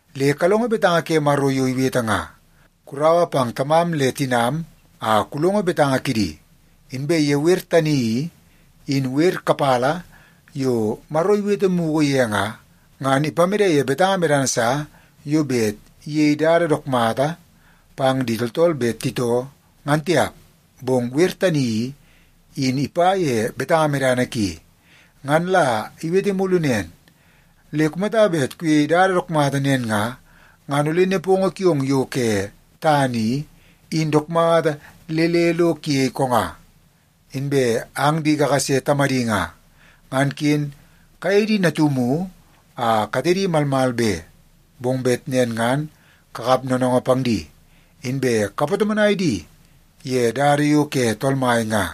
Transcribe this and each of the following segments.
Le kalongo betanga ke Maro yo iwete nga, “Kuraua pang tamam le tinam a kulongo betanga kidi.” Inbe ye wer tani i, in wer kapala yo Maro iwete mugu ye nga, ngan ipamede ye betanga medana sa yo bet iyei dada dook mata pang di tooltool bet titoo, ngan tiap, bong wer tani i, in ipa ye betanga medana ki. Ngan la iwete mulu nen, “Le kumata bet kuyei dada dook mata nen nga, ngan ole nepongo kiong yo ke tana i, in dook mata le le lo kuyei konga.” Inbe ang di kakase tamadi nga, ngan ken kayei di natumu a katedi malmal be. Bong bet nen ngan kakap noonoongoo pang di, inbe kapatomonai di ye dada yo ke Tool Mai nga.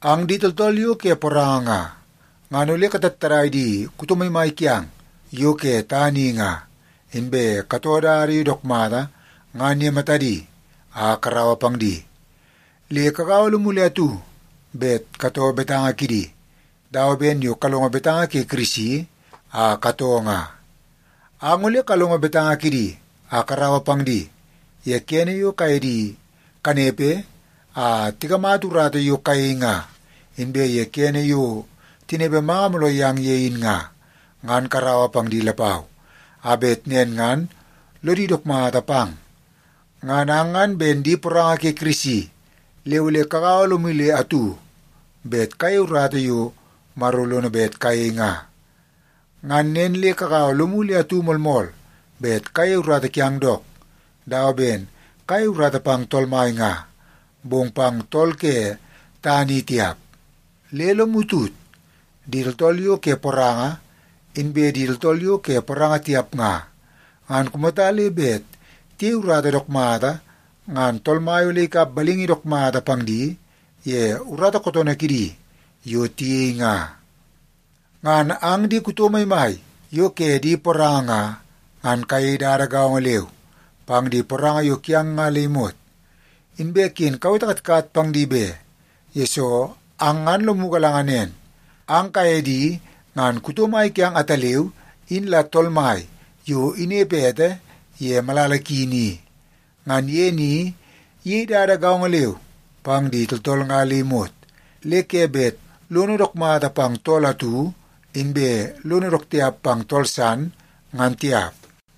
Ang di tooltool yo ke poranga nga, ngan ole katattadai di kuto maimai kiang yo ke tana i nga, inbe katoo dada yo dook mata ngan ye matadi a karaua pang di. Le kagaua lomu le atu bet katoo betanga kidi, dawa ben yo kalongo betanga ke Kirisi a katoo nga. Ang ole kalongo betanga kidi a karaua pang di ye kene yo kaye di kanepe a tikamata urata yo kayei nga, inbe ye kene yo tinepe manga mooloo yang ye in nga, ngan karaua pang di lapau, a bet nen ngan lodi dook mata pang. Ngan ang ngan ben di poranga ke Kirisi, le ole kagaua lomu le atu bet kayei urata yo Maro lono bet kayei nga. Ngan nen le kagaua lomu le atu moolmool bet kayei urata kiang dook, dawa ben kayei urata pang Tool Mai nga, bong pang tool ke tana i tiap. Le lomu tut, di tooltool yo ke poranga, inbe di tooltool yo ke poranga tiap nga, ngan kumata le bet tiyei urata dook mata, ngan Tool Mai ole ikap balingi dook mata pang di ye urata kootoonoo kidi yo tiyei nga. Ngan ang di kuto maimai yo ke di poranga nga, ngan kayei dada gaongo leu pang di poranga yo kiang nga le imot. Inbe ken kawete katkat pang di be, yesoo ang ngan lomu galanga nen, ang kaye di ngan kuto mai kiang ataleu in la Tool Mai yo inepe ete ye malala ki ni. Ngan ye ni iyei dada gaongo leu pang di tooltool nga le imot, le ke bet lono dook mata pang tool atu, inbe lono dook tiap pang tool san, ngan tiap.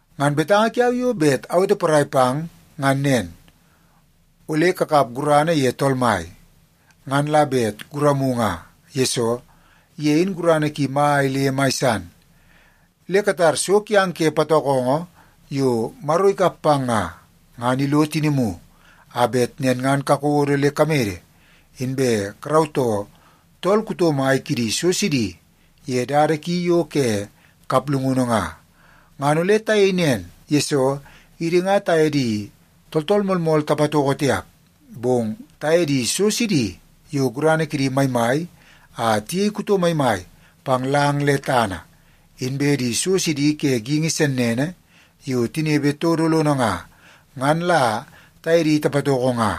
Ngan betanga kiau yo bet awete porai pang ngan nen. Ole kakap gurana ye Tool Mai, ngan la bet guramu nga, yesoo ye in gurana ki mai le mai san. Le katar so kiang ke patokongo yo Maro ikap pang nga, ngan ilo tinimu, a bet nen ngan kakodo le kamede, inbe karautoo tool kuto mai kidi so sidi ye dada ki yo ke kaplungunu nga. Ngan ole tayei nen, yesoo idi nga taye di tooltool moolmool tapatoko tiap. Bong taye di so sidi yo gurana kidi maimai a tiyei kuto maimai pang lang le tana, inbe di so sidi ke geingi sennene yo tinepe todo lono nga, ngan la taye di tapatoko nga.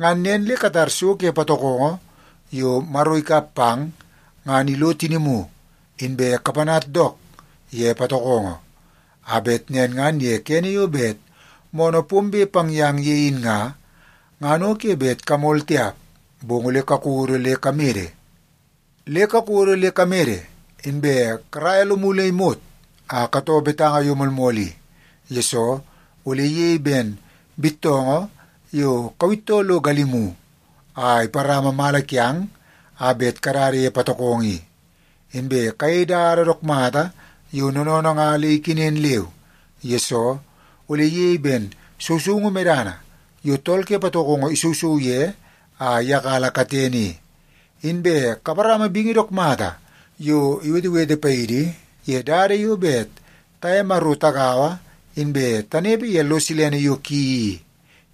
Ngan nen le katar so ke patokongo yo Maro ikap pang, ngan ilo tinimu, inbe kapanat dook ye patokongo, a bet nen ngan ye kene yo bet moonoo pombe pang yang ye in nga, ngan o ke bet kamol tiap, bong ole kakodo le kamede. Le kakodo le kamede, inbe karaia lomu le imot a katoo betanga yo moolmool i, yesoo ole iyei ben bittoongoo yo kawittoo lo galimu a iparama mala kiang a bet kadada ye patokongo i. Inbe kayei dada dook mata yo noonoonoo nga le ikenen leu, yesoo ole iyei ben sousoungu medana yo tool ke patokongo isousou ye a iyakala katene i. Inbe kaparama bingi dook mata yo iwetewete paidi ye dada yo bet taye Maro tagaua inbe tanepe ye lo silene yo ki i,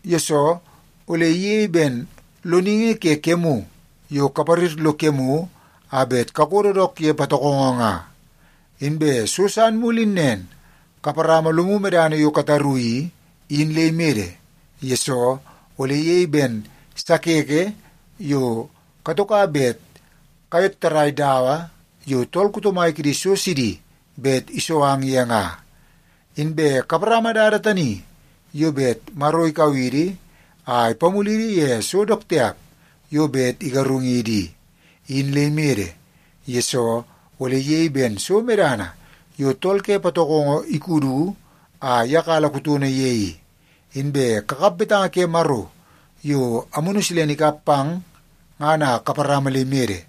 yesoo ole iyei ben loningi ke kemu yo kaparir lo kemu a bet kakodo dook ye patokongo nga. Inbe so san mulu in nen, kaparama lomu medana yo kataru i, in le imede, yesoo ole iyei ben sakeke yo katoka bet kayottarai dawa yo tool kuto mai kidi so sidi bet iso ang ye nga. Inbe kaparama dada tani yo bet Maro ikau idi a ipamulidi ye so dook tiap yo bet igarung idi i, in le imede, yesoo ole iyei ben so medana yo tool ke patokongo ikudu a iyakala kutono ye i. Inbe kakap betanga ke Maro yo Amunu Silene ikap pang ngan a kaparama le imede,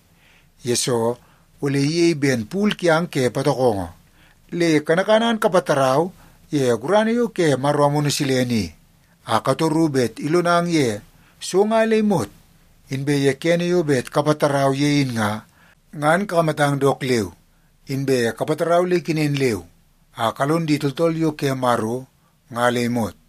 yesoo ole iyei ben pul kiang ke patokongo. Le kanakana ngan kapatarau ye gurana yo ke Maro Amunu Silene i, a katoru bet ilonang ye so nga le imot. Inbe ye kene yo bet kapatarau ye in nga, ngan kakamatang dook leu, inbe kapatarau le ikenen leu a kalon di tooltool yo ke Maro nga le imot.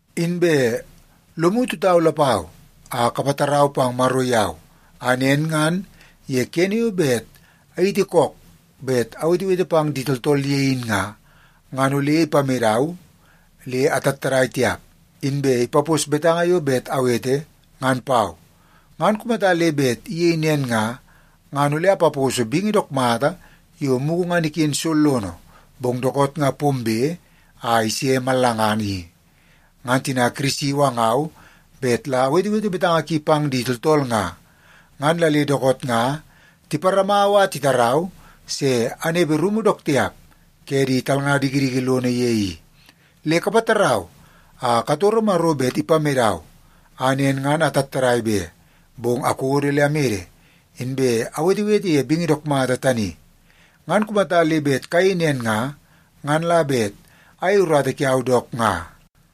Inbe lomu tutau lapau a kapatarau pang Maro yau, a nen ngan ye kene yo bet ayiti kook bet awetewete pang di tooltool ye in nga, ngan ole ipamedau le atattadai tiap, inbe ipapos betanga yo bet awete ngan pau. Ngan kumata le bet iyei nen nga, ngan ole apaposo bingi dook mata yo mugu ngan iken sollono bong dookoot nga pombe a ise mallangana i. Ngan tina Kirisi iwangau bet la awetewete betanga ki pang di tooltool nga, ngan la le dookoot nga tiparamau a titarau se anepe rumu dook tiap ke di talnga dikidiki lono ye i. Le kapatarau a katoro Maro bet ipamedau a nen ngan atattadai be, bong akodo le amede inbe awetewete ye bingi dook mata tani. Ngan kumata le bet kayei nen nga, ngan la bet ayei urata kiau dook nga.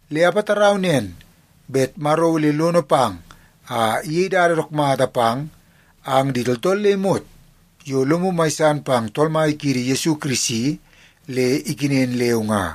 Le apatarau nen bet Maro ole lono pang a iyei dada dook mata pang ang di tooltool le imot yo lomu mai san pang Tool Mai kiidi Yesu Kirisi le ikenen leu nga.